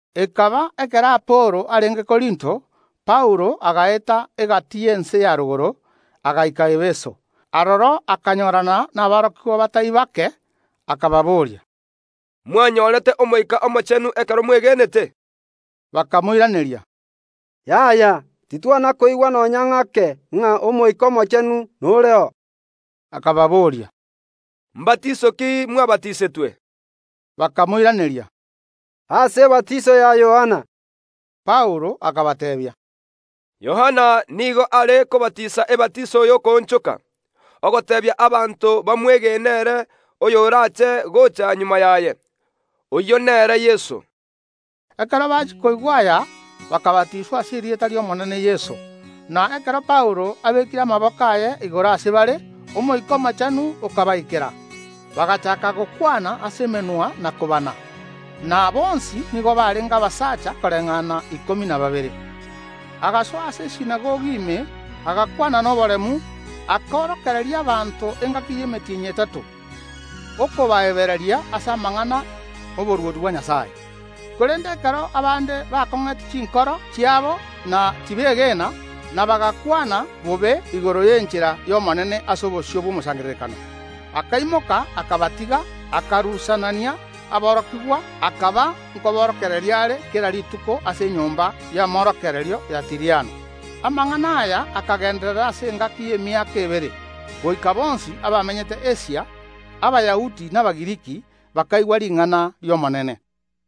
Ekaba ekero Apolo arenge Korinto, Paulo agaeta egati y’ense ya rogoro, agaika Efeso. Aroro akanyorana naborokigwa batari bake. Akababoria: “Mwanyorete Omoika Omochenu ekero mwegenete?” Bakamoiraneria: “Yaya, titwana koigwa nonya ng’ake ng’a Omoika Omochenu noreo.” Akababoria: “Mbatiiso ki mwabatisetwe?” Bakamoiraneria: “Ase ebatiiso ya Yohana.” Paulo akabateebia: “Yohana nigo aare kobatiisa ebatiso y’okoonchoka, ogoteebia abanto bamwegene ere oyorache gocha magega yaye, oyio nere Yeso.” Ekero bachia koigwa aya, bakabatiiswa ase erieta ri’Omonene Yeso. Na ekero Paulo abekire amaboko aye igoro ase bare, Omoika Omochenu okabaikera; bagachaaka gokwana ase emenwa na kobana. Na bonsi nigo barenge abasacha koreng’ana ikomi na babere. Agasoa ase esinagogi ime, agakwana noboremu, akaorokereria abanto engaki y’emetienyi etato, okobaebereria ase amang’ana y’oborwoti bwa Nyasae. Korende ekero abande bakong’etie chinkoro chiabo, na tibegena, na bagakwana bobe igoro y’Enchera y’Omonene ase obosio bw’omosangererekano, akaimoka akabatiga, akarusanania aborokigwa, akaba nkoborokereria are kera rituko ase enyomba y’amorokererio ya Tiriano. Amang’ana aya akagenderera ase engaki y’emiaka ebere, goika bonsi abamenyete Asia, Abayahudi na Abagiriki, bakaigwa ring’ana ri’Omonene.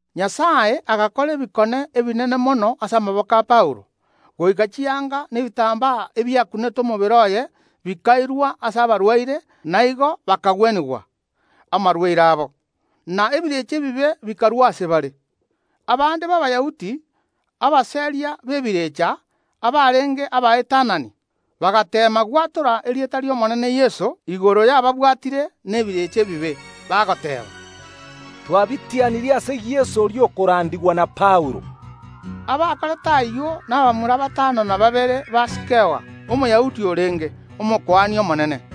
Nyasae agakora ebikone ebinene mono ase amaboko a Paulo, goika chianga na ebitambaa ebiakunete omobere oye bikairwa ase abarwaire, na igo bakagwenigwa amarwaire abo, na emeika emebe ekarua ase bare. Abande b’Abayahudi, abaseria b’emeika emebe, abarenge abaetanani, bagateema gwatora erieta ri’Omonene Yeso igoro y’ababwatire nebirecha ebibe, bagoteeba: “Twabitianirie ase Yeso oria okorandigwa na Paulo.” Abakorete ayio nabamura batano na babere ba Sikewa, Omoyahudi orenge Omokuani omonene.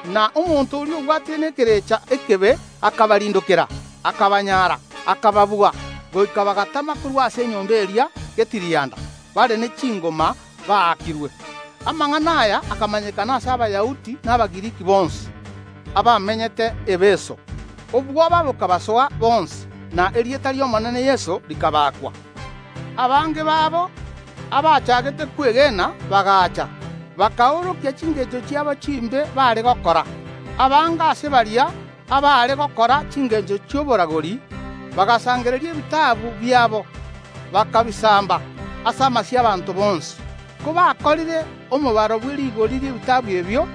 Na omonto oria obwatire n’Omoika omobe akabarindokera, akabanyara, akababua, goika bagatama korwa ase enyomba eria getirianda, bare ne chingoma baakirwe. Amang’ana aya akamanyekana ase Abayahudi na Abagiriki bonsi abamenyete Efeso; obwoba bokabasoa bonsi, na erieta ri’Omonene Yeso rikabakwa. Abange babo, abachaagete kwegena, bagaacha, bakaorokia chingencho chiabo chimbe baare gokora. Abange ase baria abaare gokora chingencho chi’oboragori, bagasangereria ebitabu biabo, bakabisamba ase amasio y’abaanto bonsi. Kobakorire omobaro bw’erigori ri’ebitabu ebio,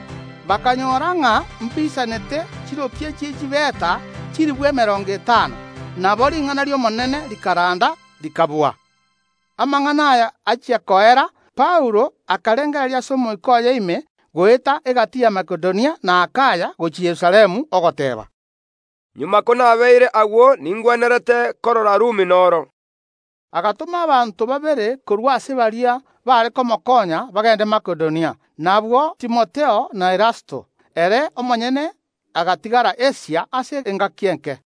bakanyora ng’a mbiisanete chiropia chi’echifeta chilifu emerongo etano. Nabo ring’ana ri’Omonene rikaranda, rikabua. Amang’ana aya achia koera, Paulo akarengereria ase omoika oye ime goeta egati ya Makedonia na Akaya gochia Yerusalemu, ogoteeba: “Magega konabeire agwo ningwenerete korora omochie o Rumi noro.” Agatoma abanto babere korwa ase baria baare komokoonya bagende Makedonia, nabwo Timotheo na Erasto. Ere omonyene agatigara Asia ase engaki enke.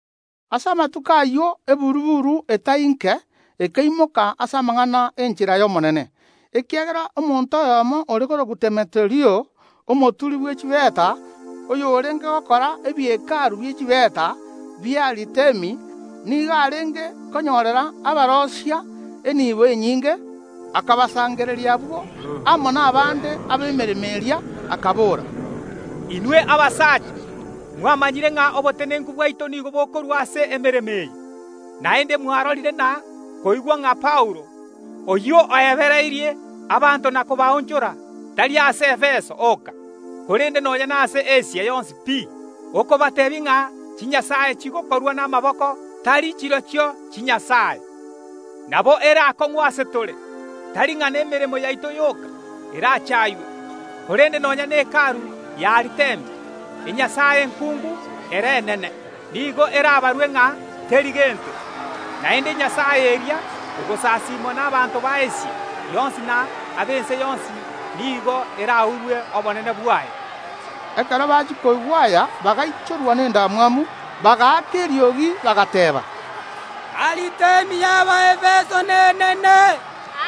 Ase amatuko ayio eburu‐buru etari nke ekaimoka ase amang’ana ’enchera y’Omonene. Ekiagera omonto oyomo ore korokwa Demeturio, omoturi bw’echifeta, oyorenge gokora ebie Hekalu bie chifeta bi’Aritemi, nigo arenge konyorera abaroisia eniibo enyinge. Akabasangereria abwo amo nabande ab’emeremo eria, akabora: “Inwe abasacha, mwamanyire ng’a obotenenku bwaito nigo bokorwa ase emeremo eye. Naende mwarorire na koigwa ng’a Paulo, oyio oebereirie abanto na kobaonchora, tari ase Efeso oka, korende nonya nase Asia yonsi pi, okobateebia ng’a chinyasae chigokorwa namaboko tari chirochio chinyasae. Nabo ere aakong’u ase tore, tari ng’a nemeremo yaito yoka erachaywe, korende nonya ne Hekalu y’Aritemi, enyasae enkuungu ere enene, nigo erabarwe ng’a teri gento. Naende enyasae eria, egosasimwa n’abanto b’Asia yonsi na ab’ense yonsi nigo eraurwe obonene bwaye.” Ekero bachia koigwa aya bagaichorwa nendamwamu, bagaaka eriogi, bagateeba: “Aritemi y’Abaefeso nenene!”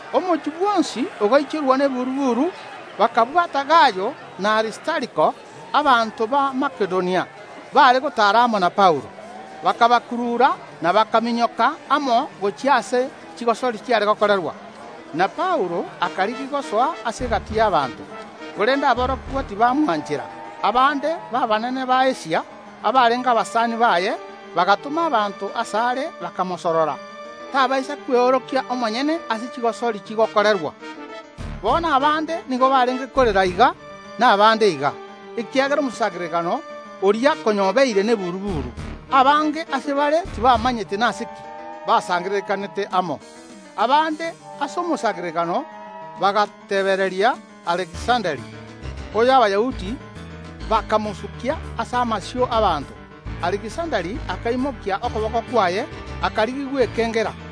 Omochie bwonsi ogaichorwa neburu‐buru, bakabwata Gayo na Aristariko, abanto ba Makedonia, baare gotaara amo na Paulo, bakabakurura na bakaminyoka amo gochia aase chigosori chigokorerwa. Na Paulo akarigia gosoa ase egati y’abanto, korende aborokigwa tibamwanchera. Abande b’abanene b’Asia, abarenge abasani baye, bagatoma abanto asare, bakamosorora tabaisa kweorokia omonyene aase chigosori chigokorerwa. Bono abande nigo barenge korera iga, na abande iga, ekiagera omosangererekano oria konya obeire neburu‐buru. Abange ase bare tibamanyete nase ki basangererekanete amo. Abande ase omosangererekano bagatebereria Alekisanda, oyo Abayahudi bakamosukia ase amaiso ’abaanto. Alekisanda akaimokia okoboko kwaye, akarigia gwekengera.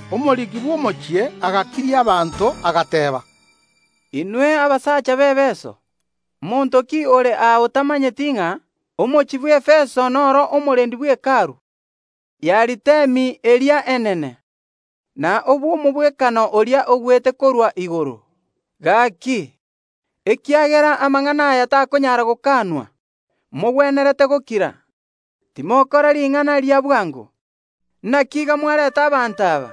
Omoriki bw’omochie agakiria abanto agateeba: “Inwe abasacha b’Efeso, monto ki ore aa otamanyeti ng’a omochie bw’Abaefeso noro omorendi bwe Hekalu y’Aritemi eria enene, na obw’omogwekano oria ogwete korwa igoro? Gaki, ekiagera amang’ana aya takonyara gokanwa, mogwenerete gokira, timokora ring’ana ria bwango. Naki iga mwarenta abanto aba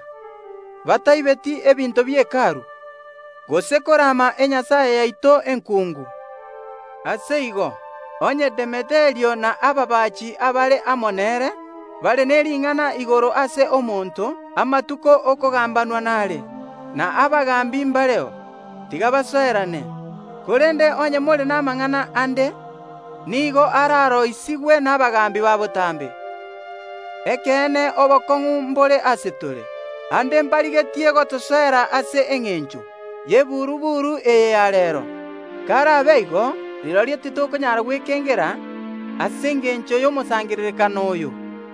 bataibeti ebinto bie Hekalu gose korama enyasae yaito enkuungu. Ase igo, onye Demeturio na ababaachi abare amo nere bare ne ring’ana igoro ase omonto, amatuko ’yokogambigwa nare, na abagaambi mbareo, tiga basoerane. Korende onye more namang’ana ande, nigo araroisigwe nabagaambi ba botambe. Ekeene obokong’u mbore ase tore, aande mbarigetie gotosoera ase engencho y’eburu‐buru eye ya reero. Karabe igo, rirorio titokonyaara gwekengera ase engencho y’omosangererekano oyo.”